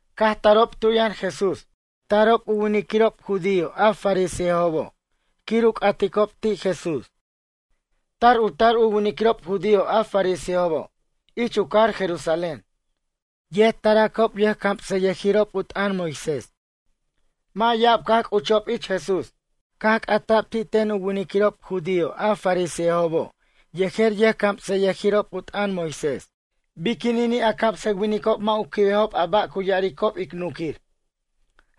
Caj tarob tu yʌn Jesús. Tarob u winiquirob judío a fariseobo' quir u c'aticob ti' Jesús. Tar u tar u winiquirob judío a fariseobo' ich u cajar Jerusalén. Yet taracob yʌjcamsʌyʌjirob u t'ʌn Moisés. Mʌ' ya'ab caj c'uchob ich Jesús. Caj c'ata'b ti' ten u winiquirob judío a fariseobo' yejer yʌjcamsʌyʌjirob u t'ʌn Moisés: ―Biquinini' a camsʌwinicob mʌ' u quibejob a ba' cu ya'aricob ic nunquir?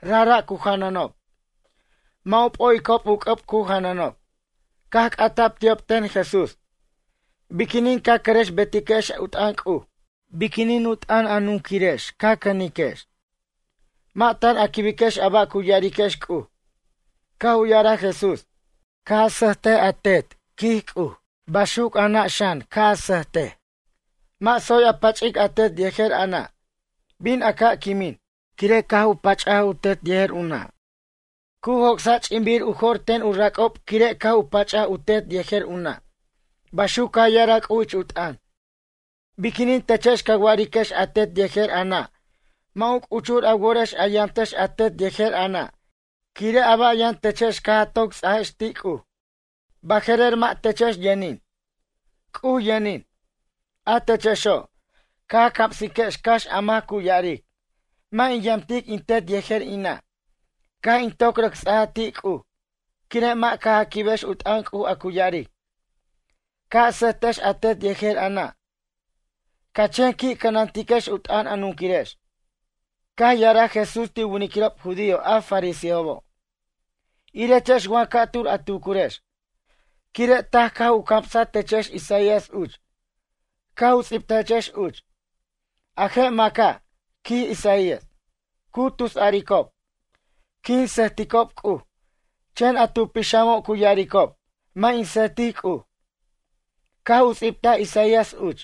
Rajra' cu janʌnob. Mʌ' u p'o'icob u c'ʌb cu janʌnob. Caj c'ata'b ti'ob ten Jesús: ―Biquinin ca cʌrʌx betiquex u t'ʌn C'uj? Biquinin u t'ʌn a nunquirex ca cʌniquex? Mʌ' tan a quibiquex a ba' cu ya'ariquex C'uj. Caj u ya'araj Jesús: ―“Ca' a sʌjt a tet, quij C'uj. Baxuc a nʌ' xan ca sʌjtic. Mʌ' tsoy a pach'ic a tet yejer a nʌ'. Bin a ca' quimin, quire' caj pach'aj u tet yejer u nʌ'. Cu joc'sa' ch'inbir u jo'r ten u rac'ob quire' caj u pach'aj u tet yejer u nʌ'.” Baxuc caj ya'araj C'uj ich u t'ʌn. Biquinin techex ca wa'ariquex a tet yejer a nʌ' mʌ' u c'uchur a worex a yamtex a tet yejer a nʌ' quire' a ba' yʌn techex caj a toc ts'ajex ti' C'uj? Baje'rer mʌ' techex yʌnin, C'uj yʌnin. A techexo', ca camsiquex cax a mac cu ya'aric: “Mʌ' in yamtic in tet yejer in nʌ'. Caj in toc rʌc ts'aj ti' C'uj.” Quire' mʌ' caj a quibex u t'ʌn C'uj a cu ya'aric: “Ca' a sʌjtex a tet yejer a nʌ'.” Ca chen qui' cʌnantiquex u t'ʌn a nunquirex. Caj ya'araj Jesús ti' u winiquirob judío a fariseobo': ―Irechex wa ca'tur a tucurex, quire' taj caj u camsa techex Isaías uch. Caj u ts'ibtajechex uch: A je' maca', quij Isaías. Cu tusaricob: “Quin sʌjticob C'uj”, chen a tu pixamo' cu ya'aricob: “Mʌ' in sʌjtic C'uj.” Caj u ts'ibtaj Isaías uch: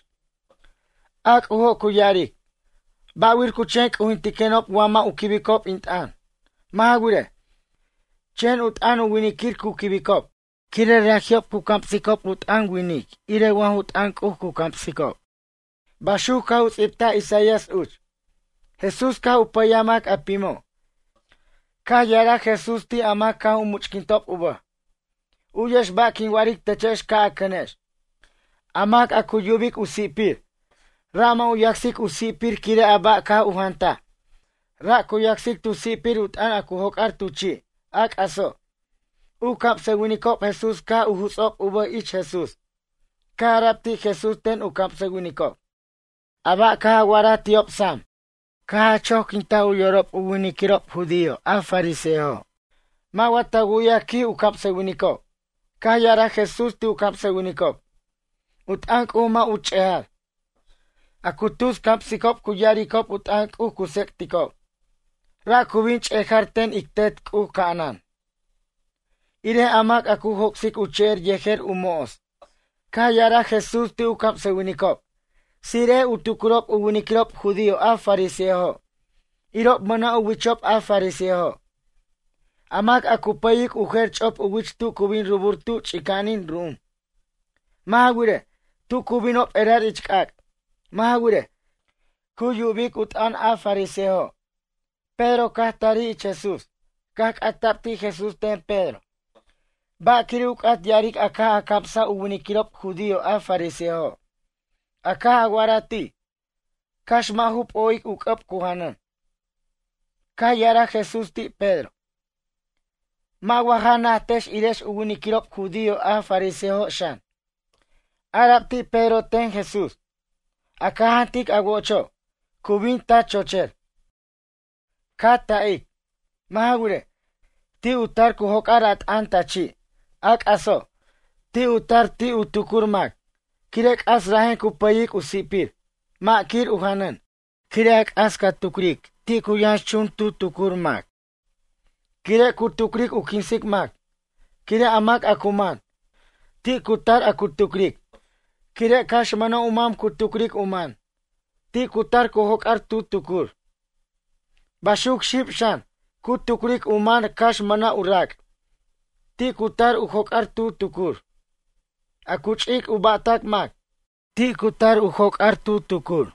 A C'ujo' cu ya'aric: “Ba'wir cu chen c'ujintiquenob wa mʌ' u quibicob in t'ʌn? Mʌ' ja wirej, chen u t'ʌn winiquir cu quibicob quire' raji'ob cu camsicob u t'ʌn winic irej wa ju t'ʌn C'uj cu camsicob.” Baxuc caj u ts'ibtaj Isaías uch. Jesús caj u pʌyaj mac a pimo'. Caj ya'araj Jesús ti' a mac caj u much'quintob u bʌj: ―U'yex ba' quin wa'aric techex ca' a cʌnex. A mac a cu yubic u si'pir, ra' mʌ' u yacsic u si'pir quire' a ba' caj u jantaj. Ra' cu yacsic tu si'pir u t'ʌn a cu joc'ar tu chi', a c'aso'. U camsʌwinicob Jesús caj u juts'ob u bʌj ich Jesús. Caj ara'b ti' Jesús ten u camsʌwinicob: ―A ba' caj a wa'araj ti'ob sam, caj a choquintaj u yorob u winiquirob judío a fariseojo'. Mʌ' wa ta wu'yaj ―quij u camsʌwinicob? Caj ya'araj Jesús ti' u camsʌwinicob: ―U t'ʌn C'uj mʌ' u ch'eja'r. A cu tus camsicob cu ya'aricob u t'ʌn C'uj cu tsec'ticob. Ra' cu bin ch'eja'r ten ic Tet C'uj ca'anan. Irej a mac a cu joc'sic u che'er yejer u mo'os. Caj ya'araj Jesús ti' u camsʌwinicob: ―Tsire'ej u tucurob u winiquirob judío a fariseojo'. Irob mʌna' u wichob a fariseojo'. A mac a cu pʌyic u jer ch'op u wich tu cu bin rubur tu ch'ica'anin ru'um. Mʌ' ja wirej, tu cu binob erar ich c'ac'. Mʌ' ja wirej, cu yubic u t'ʌn a fariseojo'. Pedro caj tarij ich Jesús. Caj c'ata'b ti' Jesús ten Pedro: ―Ba' quire' u c'at ya'aric a caj a camsaj u winiquirob judío a fariseojo'. A caj a wa'araj ti': “Cax mʌ' ju p'o'ic u c'ʌb cu janʌn.” Caj ya'araj Jesús ti' Pedro: ―Mʌ' wa ja najtex irechex u winiquirob judío a fariseojo' xan? Ara'b ti' Pedro ten Jesús: ―A ca jantic a wo'ocho', cu bin ta chocher, ca ta'ic. Mʌ' ja wirej, ti' u tar cu joc'ar a t'ʌn ta chi'. A c'aso', ti' u tar ti' u tucur mac. Quire' c'as rajen cu pʌyic u si'pir. Mʌ' quir u janʌn. Quire' a c'as ca tucric ti' cu yʌnxchun tu tucur mac, quire' cu tucric u quinsic mac. Quire' a mac a cu man, ti' cu tar a cu tucric. Quire' cax mʌna' u mam cu tucric u man, ti' cu tar cu joc'ar tu tucur. Baxuc xib xan, cu tucric u man cax mʌna' u rac'. Ti' cu tar u joc'ar tu tucur. A cu ch'ic u ba'tʌc mac, ti' cu tar u joc'ar tu tucur.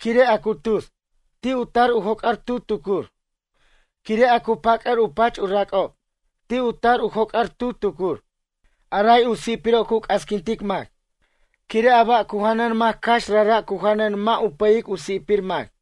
Quire' a cu tus, ti' u tar u joc'ar tu tucur. Quire' a cu pac'ʌr u pach u rac'ob, ti' u tar u joc'ar tu tucur. A ray u si'piro' cu casquintic mac. Quire' a ba' cu janʌn mac cax rajra' cu janʌn mʌ' u pʌyic u si'pir mac.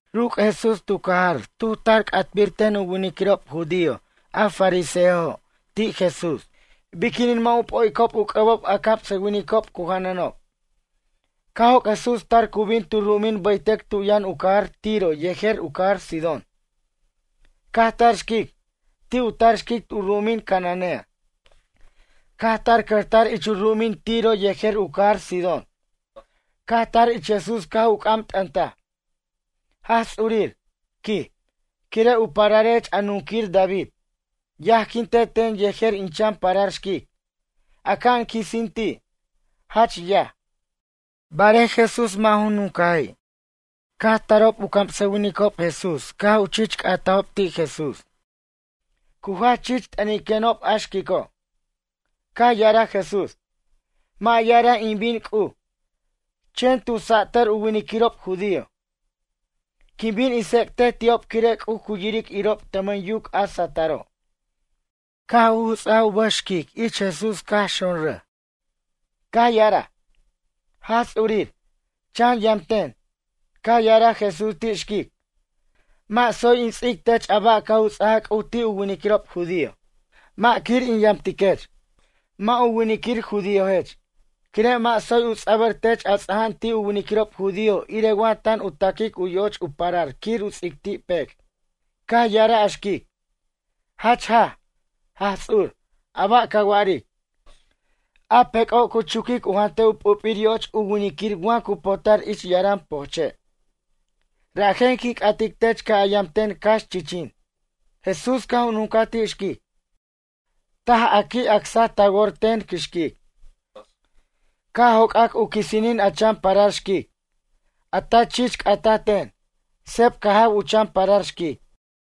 Ruc' Jesús tu cajar tuj tar c'atbir ten u winiquirob judío a fariseojo' ti' Jesús: ―Biquinin mʌ' u p'o'icob u c'ʌbob a camsʌwinicob cu janʌnob? Caj joc' Jesús tar cu bin tu ru'um bʌytʌc tu yʌn u cajar Tiro yejer u cajar Sidón. Caj tar xquic. Ti' u tar xquic u ru'umin cananea. Caj tar cʌjtar ich u ru'umin Tiro yejer u cajar Sidón. Caj tar ich Jesús caj u c'am t'ʌntaj: ―Jaj Ts'urir ―quij―, quire' u pararech a nunquir David. Yajquinte ten yejer in chan parar xquic. Aca'an quisin ti', jach yaj. Barej Jesús mʌ' ju nuncaji'. Caj tarob u camsʌwinicob Jesús caj u chich c'atajob ti' Jesús: ―Cu jach chich t'ʌniquenob a xquico'. Caj ya'araj Jesús: ―Mʌ' ya'araj in bin C'uj, chen tu satʌr u winiquirob judío. Quin bin in tsec'tej ti'ob quire' C'uj cu yiric irob tʌmʌn yuc a satʌro'. Caj u juts'aj u bʌj xquic ich Jesús caj xonrʌj. Caj ya'araj: ―Jaj Ts'urir, chan yam ten. Caj ya'araj Jesús ti' xquic: ―Mʌ' tsoy in ts'ic tech a ba' caj u ts'aja C'uj ti' u winiquirob judío. Mʌ' quir in yamtiquech. Mʌ' u winiquir judíojech. Quire' mʌ' tsoy u ts'abʌr tech a ts'aja'an ti' u winiquirob judío irej wa tan u taquic u yoch u parar quir u ts'ic ti' pec'. Caj ya'araj a xquic: ―Jach jaj, Jaj Ts'ur, a ba' ca wa'aric. A pec'o' cu chuquic u jantej u p'up'ir yo'och u winiquirir wa cu potar ich yaran pojche'. Rajen quin c'atic tech ca' a yam ten cax chichin. Jesús caj u nuncaj ti' xquic: ―Taj caj a qui' acsaj ta wor ten xquic. Ca' joc'ac u quisinin a chan parar xquic. A ta chich c'ata ten. Sep caj jaw u chan parar xquic.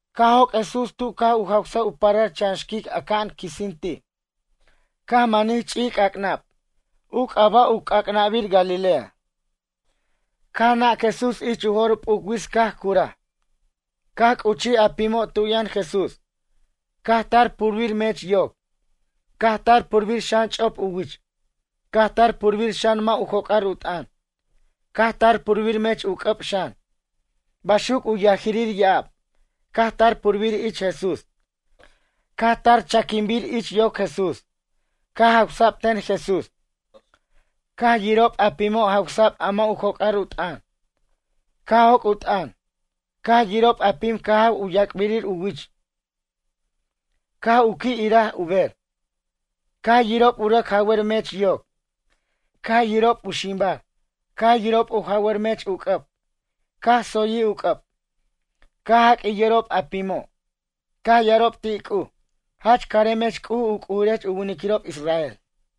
Caj joc' Jesús tu caj u jawsaj u parar chan xquic aca'an quisin ti'. Caj manij chi'c'ac'nab. U c'aba' u c'ac'nabir Galilea. Caj nac Jesús ich u jo'r p'uc wits caj curaj. Caj c'uchij a pimo' tu yʌn Jesús. Caj tar purbir mech yoc. Caj tar purbir xan ch'op u wich. Caj tar purbir xan mʌ' u joc'ar u t'ʌn. Caj tar purbir mech u c'ʌb xan. Baxuc u yajirir ya'ab, caj tar purbir ich Jesús. Caj tar chaquinbir ich yoc Jesús. Caj jawsa'b ten Jesús. Caj yirob a pimo' jawsa'b a mʌ' u joc'ar u t'ʌn, caj joc' u t'ʌn. Caj yirob a pim caj jaw u yac'bir u wich, caj u qui' iraj u ber. Caj yirob u rʌc jawʌr mech yoc, caj yirob u ximbar. Caj yirob u jawʌr mech u c'ʌb, caj tsoyij u c'ʌb. Caj jaq'uij yorob a pimo'. Caj ya'arab ti' C'uj: ―Jach caremech C'uj u C'ujirech u winiquirob israel.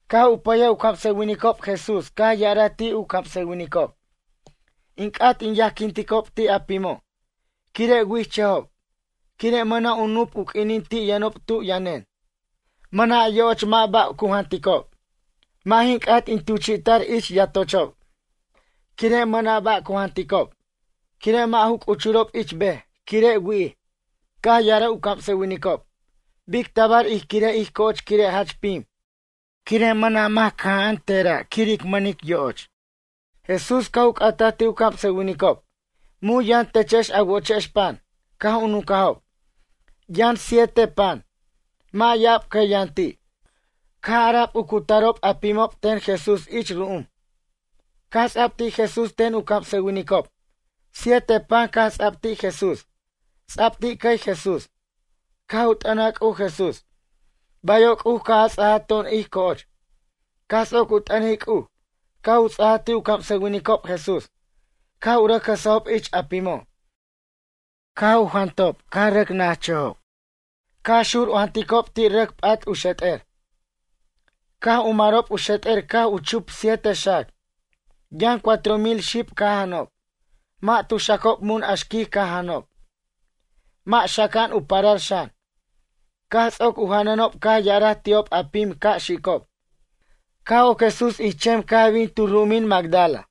Caj u pʌyaj u camsʌwinicob Jesús caj ya'araj ti' u camsʌwinicob: ―In c'at in yajquinticob ti' a pimo', quire' wi'ichʌjob. Quire' mʌna' u nup u q'uinin ti' yʌnob tu yʌnen. Mʌna' yo'och, mʌ' ba' cu janticob. Mʌ' jin c'at in tuchi'ta'r ich yatochob, quire' mʌna' ba' cu janticob. Quire' mʌ' ju c'uchurob ich bej, quire' wi'ij. Caj ya'araj u camsʌwinicob: ―Bic tabar ij quirej ij co'och quire' jach pim? Quire' mʌna' mac cʌja'an tera' quir ic mʌnic yo'och. Jesús caj u c'ataj ti' u camsʌwinicob: ―Mun yʌn techex a wo'ochex pan? Caj u nuncajob: ―Yʌn siete pan. Mʌ' ya'ab cʌy yʌn ti'. Caj ara'b u cutarob a pimo' ten Jesús ich ru'um. Caj ts'a'b ti' Jesús ten u camsʌwinicob. Siete pan caj ts'a'b ti' Jesús. Ts'a'b ti' cʌy Jesús. Caj u t'ʌnaj C'uj Jesús: ―Bayo' C'uj caj a ts'aj to'on ij co'och. Caj ts'oc u t'ʌnic C'uj, caj u ts'aja ti' u camsʌwinicob Jesús. Caj u rʌc jʌsajob ich a pimo'. Caj jantob caj rʌc najchʌjob. Caj xur u janticob ti' rʌc p'at u xet'er. Caj u marob u xet'er caj chup siete xac. Yʌn cuatro mil xib caj janob. Mʌ' tu xacob mun a xquic caj janʌnob. Mʌ' xaca'an u parar xan. Caj ts'oc u janʌnob caj ya'araj ti'ob a pim ca' xicob. Caj oc Jesús ich chem caj bin tu ru'umin Magdala.